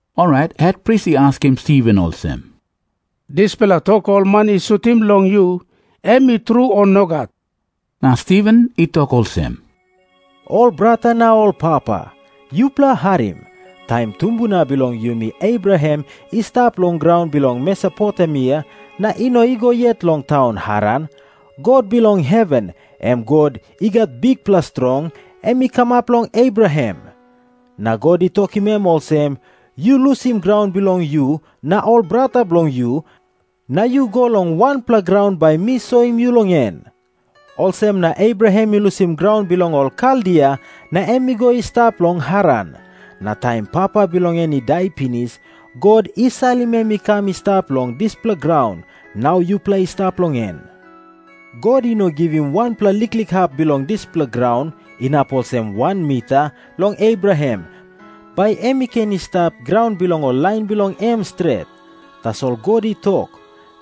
Orait hetpris i askim Stiven olsem, “Dispela tok ol man i sutim long yu, em i tru, o nogat?” Na Stiven i tok olsem, “Ol brata na ol papa, yupela harim. Taim tumbuna bilong yumi Abraham i stap long graun bilong Mesopotemia na i no i go yet long taun Haran, God bilong heven, em God i gat bikpela strong, em i kamap long Abraham. Na God i tokim em olsem, ‘Yu lusim graun bilong yu na ol brata bilong yu, na yu go long wanpela graun bai mi soim yu long en.’ Olsem na Abraham i lusim graun bilong ol Kaldia na em i go i stap long Haran. Na taim papa bilong en i dai pinis, God i salim em i kam i stap long dispela graun, nau yupela i stap long en. God i no givim wanpela liklik hap bilong dispela graun, inap olsem wan mita, long Abraham, bai em i ken i stap graun bilong ol lain bilong em stret. Tasol God i tok,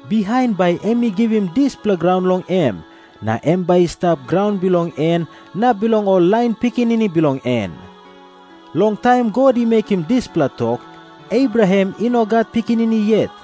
bihain bai em i givim dispela graun long em, na em bai i stap graun bilong en na bilong ol lain pikinini bilong en. Long taim God i mekim dispela tok, Abraham i no gat pikinini yet.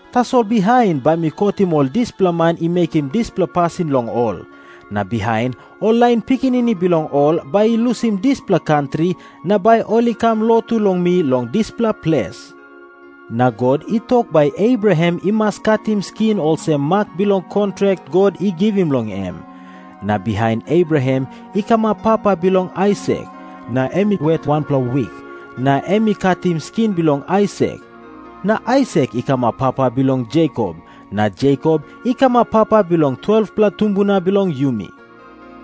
Tasol bihain bai mi kotim ol dispela man i mekim dispela pasin long ol. Na bihain ol lain pikinini bilong ol bai i lusim dispela kantri na bai ol i kam lotu long mi long dispela ples.’ Na God i tok bai Abraham i mas katim skin olsem mak bilong kontrak God i givim long em. Na bihain Abraham i kamap papa bilong Aisak, na em i wet wanpela wik na em i katim skin bilong Aisak. Na Aisak i kamap papa bilong Jekop, na Jekop i kamap papa bilong ol 12-pela tumbuna bilong yumi.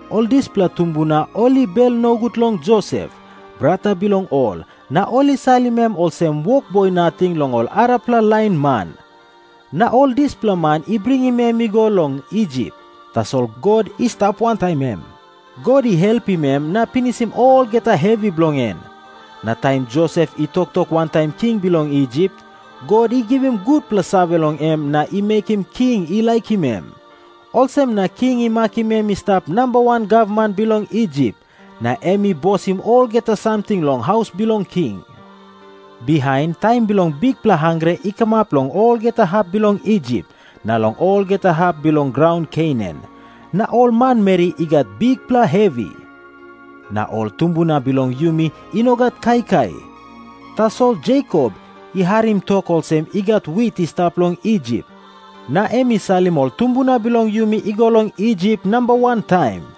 “Ol dispela tumbuna ol i bel nogut long Josep, brata bilong ol, na ol i salim em olsem wokboi nating long ol arapela lain man. Na ol dispela man i bringim em i go long Isip. Tasol God i stap wantaim em. God i helpim em na i pinisim olgeta hevi bilong en. Na taim Josep i toktok wantaim king bilong Isip, God i givim gutpela save long em na i mekim king i laikim em. Olsem na king i makim em i stap namba wan gavman bilong Isip, na em i bosim olgeta samting long haus bilong king. “Bihain taim bilong bikpela hangre i kamap long olgeta hap bilong Isip na long olgeta hap bilong graun Kenan, na ol manmeri i gat bikpela hevi. Na ol tumbuna bilong yumi i no gat kaikai. Tasol Jekop i harim tok olsem i gat wit i stap long Isip, na em i salim ol tumbuna bilong yumi i go long Isip namba wan taim.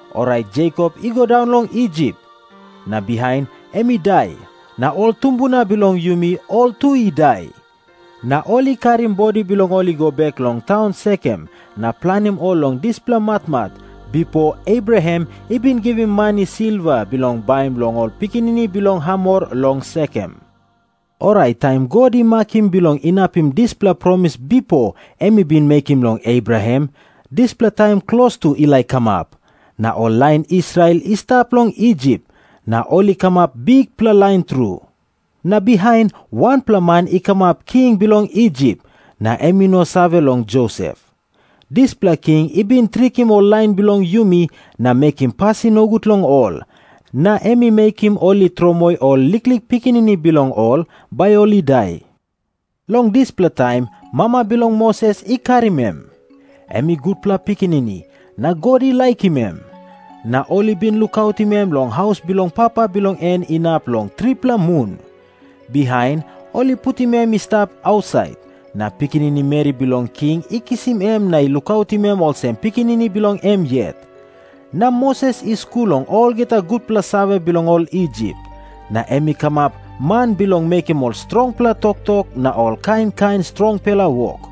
Orait Jekop i go daun long Isip. Na bihain em i dai, na ol tumbuna bilong yumi ol tu i dai. Na ol i karim bodi bilong ol i go bek long taun Sekem na planim ol long dispela matmat, bipo Abraham i bin givim mani silva bilong baim long ol pikinini bilong Hamor long Sekem. “Orait taim God i makim bilong inapim dispela promis bipo em i bin mekim long Abraham, dispela taim klostu i laik kamap. Na ol lain Israel i stap long Isip, na ol i kamap bikpela lain tru. Na bihain wanpela man i kamap king bilong Isip, na em i no save long Josep. Dispela king i bin trikim ol lain bilong yumi na mekim pasin nogut long ol. Na em i mekim ol i tromoi ol liklik pikinini bilong ol, bai ol i dai. Long dispela taim mama bilong Moses i karim em. Em i gutpela pikinini, na God i laikim em. Na ol i bin lukautim em long haus bilong papa bilong en inap long tripela mun. Bihain ol i putim em i stap ausait, na pikinini meri bilong king i kisim em na i lukautim em olsem pikinini bilong em yet. Na Moses i skul long olgeta gutpela save bilong ol Isip, na em i kamap man bilong mekim ol strongpela toktok na ol kain kain strongpela wok.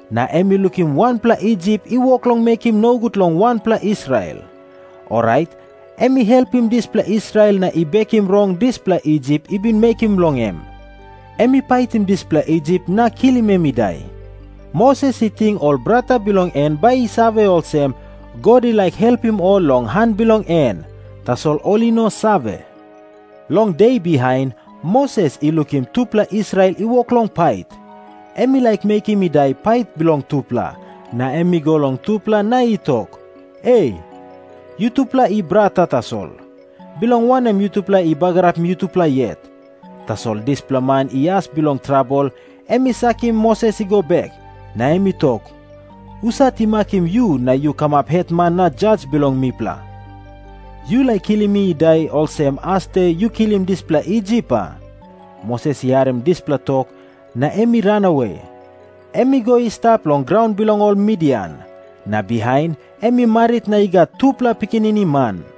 Na em i lukim wanpela Isip i wok long mekim nogut long wanpela Israel. Orait em i helpim dispela Israel na i bekim rong dispela Isip i bin mekim long em. Em i paitim dispela Isip na kilim em i dai. Moses i ting ol brata bilong en bai i save olsem, God i laik helpim ol long han bilong en. Tasol ol i no save. Long de bihain, Moses i lukim tupela Israel i wok long pait. Em i laik mekim i dai pait bilong tupela, na em i go long tupela na i tok, ‘E, yutupela i brata tasol. Bilong wanem yutupela i bagarapim yutupela yet?’ Tasol dispela man i as bilong trabel em i sakim Moses i go bek. Na em i tok, ‘Husat i makim yu na yu kamap hetman na jas bilong mipela? Yu laik kilim mi i dai, olsem asde yu kilim dispela Isip, a?’ Moses i harim dispela tok, na em i ranawe. Em i go i stap long graun bilong ol Midian. Na bihain em i marit na i gat tupela pikinini man.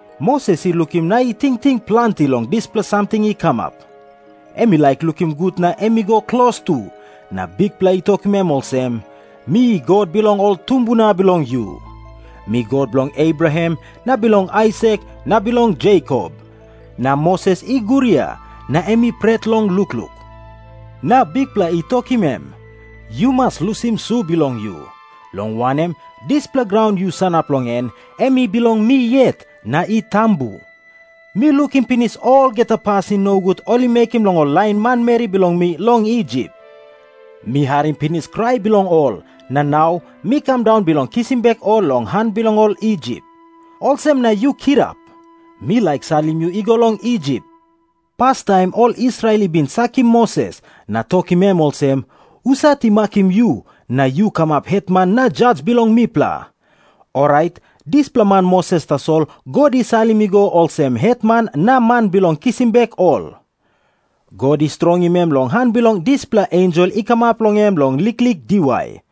Moses i lukim na i tingting planti long dispela samting i kamap. Em i laik lukim gut na em i go klostu, na Bikpela i tokim em olsem, ‘Mi God bilong ol tumbuna bilong yu. Mi God bilong Abraham na bilong Aisak na bilong Jekop.’ Na Moses i guria, na em i pret long lukluk. Na Bikpela i tokim em, ‘Yu mas lusim su bilong yu, long wanem, dispela graun yu sanap long en em i bilong mi yet na i tambu. Mi lukim pinis olgeta pasin nogut ol i mekim long ol lain manmeri bilong mi long Isip. Mi harim pinis krai bilong ol, na nau mi kam daun bilong kisim bek ol long han bilong ol Isip. Olsem na yu kirap. Mi laik salim yu i go long Isip.’ “Pastaim ol Israel i bin sakim Moses, na tokim em olsem, ‘Husat i makim yu na yu kamap hetman na jas bilong mipela?’ Orait dispela man Moses tasol God i salim i go olsem hetman na man bilong kisim bek ol. God i strongim em long han bilong dispela ensel i kamap long em long liklik diwai.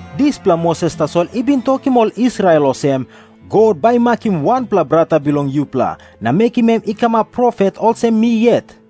Dispela Moses tasol i bin tokim ol Israel olsem, ‘God bai i makim wanpela brata bilong yupela, na mekim em i kamap profet olsem mi yet.’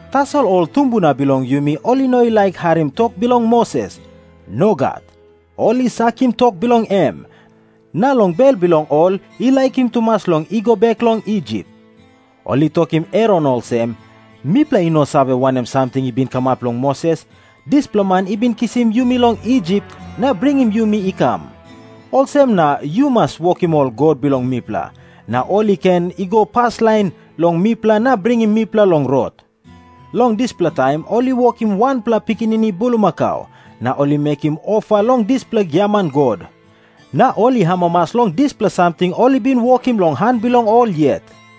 “Tasol ol tumbuna bilong yumi ol i no laik harim tok bilong Moses. Nogat. Ol i sakim tok bilong em, na long bel bilong ol i laikim tumas long i go bek long Isip. Ol i tokim Aron olsem, ‘Mipela i no save wanem samting i bin kamap long Moses, dispela man i bin kisim yumi long Isip na bringim yumi i kam. Olsem na yu mas wokim ol god bilong mipela, na ol i ken i go paslain long mipela na bringim mipela long rot.’ Long dispela taim ol i wokim wanpela pikinini bulmakau, na ol i mekim ofa long dispela giaman god. Na ol i amamas long dispela samting ol i bin wokim long han bilong ol yet.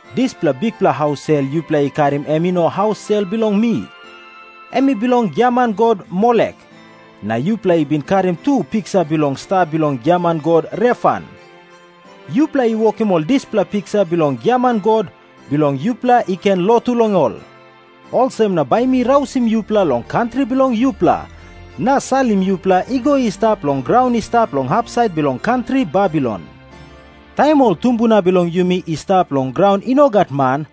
Dispela bikpela haus sel yupela i karim em i no haus sel bilong mi. Em i bilong giaman god Molek. Na yupela i bin karim tu piksa bilong sta bilong giaman god Refan. Yupela i wokim ol dispela piksa bilong giaman god, bilong yupela i ken lotu long ol. Olsem na bai mi rausim yupela long kantri bilong yupela, na salim yupela i go i stap long graun i stap long hapsait bilong kantri Babilon.’ “Taim ol tumbuna bilong yumi i stap long graun i no gat man,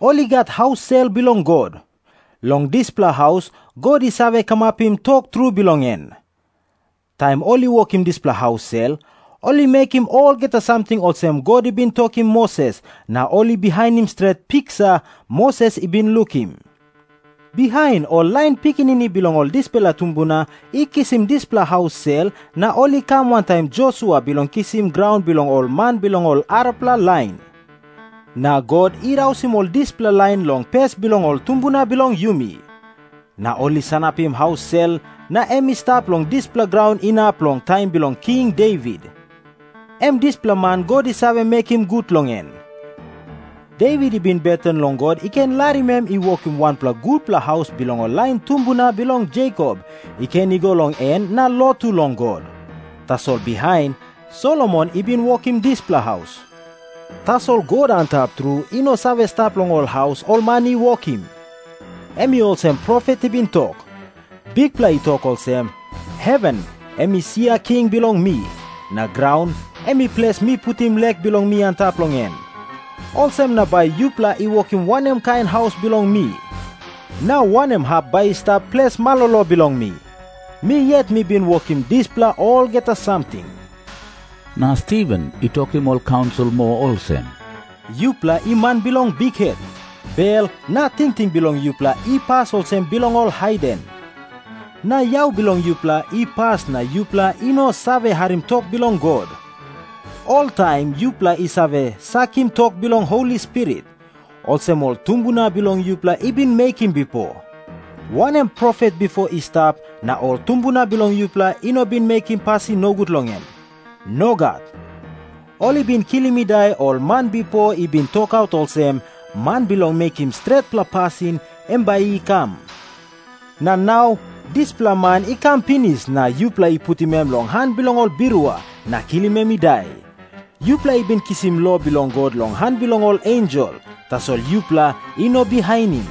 ol i gat haus sel bilong God. Long dispela haus God i save kamapim tok tru bilong en. Taim ol i wokim dispela haus sel, ol i mekim olgeta samting olsem God i bin tokim Moses na ol i bihainim stret piksa Moses i bin lukim. Bihain ol lain pikinini bilong ol dispela tumbuna i kisim dispela haus sel na ol i kam wantaim Josua bilong kisim graun bilong ol man bilong ol arapela lain. Na God i rausim ol dispela lain long pes bilong ol tumbuna bilong yumi. Na ol i sanapim haus sel na em i stap long dispela graun inap long taim bilong King Devit, em dispela man God i save mekim gut long en. Devit i bin beten long God i ken larim em i wokim wanpela gutpela haus bilong ol lain tumbuna bilong Jekop i ken i go long en na lotu long God. Tasol bihain, Solomon i bin wokim dispela haus. “Tasol God Antap Tru i no save stap long ol haus ol man i wokim. Em i olsem profet i bin tok, ‘Bikpela i tok olsem, “Heven em i sia king bilong mi, na graun em i ples mi putim lek bilong mi antap long en. Olsem na bai yupela i wokim wanem kain haus bilong mi? Na wanem hap bai i stap ples malolo bilong mi? Mi yet mi bin wokim dispela olgeta samting.” ’ Na Stiven i tokim ol kaunsil moa olsem, “Yupela i man bilong bikhet. Bel na tingting bilong yupela i pas olsem bilong ol haiden. Na yau bilong yupela i pas na yupela i no save harim tok bilong God. Oltaim yupela i save sakim tok bilong Holi Spirit, olsem ol tumbuna bilong yupela i bin mekim bipo. Wanem profet bipo i stap, na ol tumbuna bilong yupela i no bin mekim pasin nogut long em? Nogat. Ol i bin kilim i dai ol man bipo i bin tokaut olsem, Man Bilong Mekim Stretpela Pasin, em bai i kam. Na nau dispela man i kam pinis na yupela i putim em long han bilong ol birua na kilim em i dai. Yupela i bin kisim lo bilong God long han bilong ol ensel, tasol yupela i no bihainim.”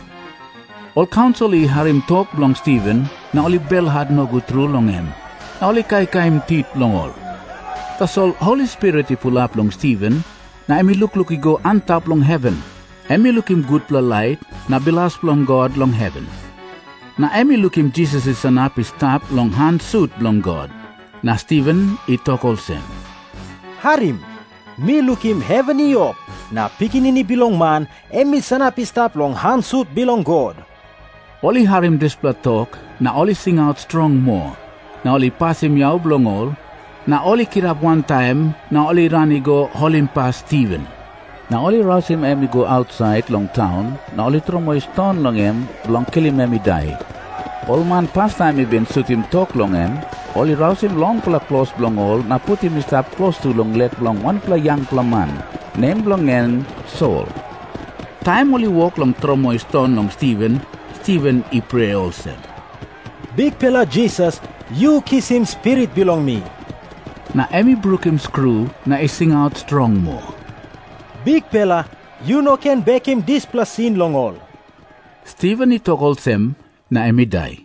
Ol kaunsil i harim tok bilong Stiven, na ol i belhat nogut tru long em na ol i kaikaim tit bilong ol. Tasol Holi Spirit i pulap long Stiven, na em i lukluk i go antap long heven. Em i lukim gutpela lait na bilas bilong God long heven, na em i lukim Jisas i sanap i stap long han sut bilong God. Na Stiven i tok olsem, “Harim. Mi lukim heven i op, na Pikinini Bilong Man em i sanap i stap long han sut bilong God.” Ol i harim dispela tok na ol i singaut strong moa, na ol i pasim yau bilong ol. Na ol i kirap wantaim na ol i ran i go holimpas Stiven. Na ol i rausim em i go ausait long taun, na ol i tromoi ston long em bilong kilim em i dai. Ol man pastaim i bin sutim tok long em, ol i rausim longpela klos bilong ol na putim i stap klostu long lek bilong wanpela yangpela man, nem bilong en Sol. Taim ol i wok long tromoi ston long Stiven, Stiven i prea olsem, “Bikpela Jisas, yu kisim spirit bilong mi.” Na em i brukim skru na i singaut strong moa, “Bikpela, yu no ken bekim dispela sin long ol.” Stiven i tok olsem, na em i dai.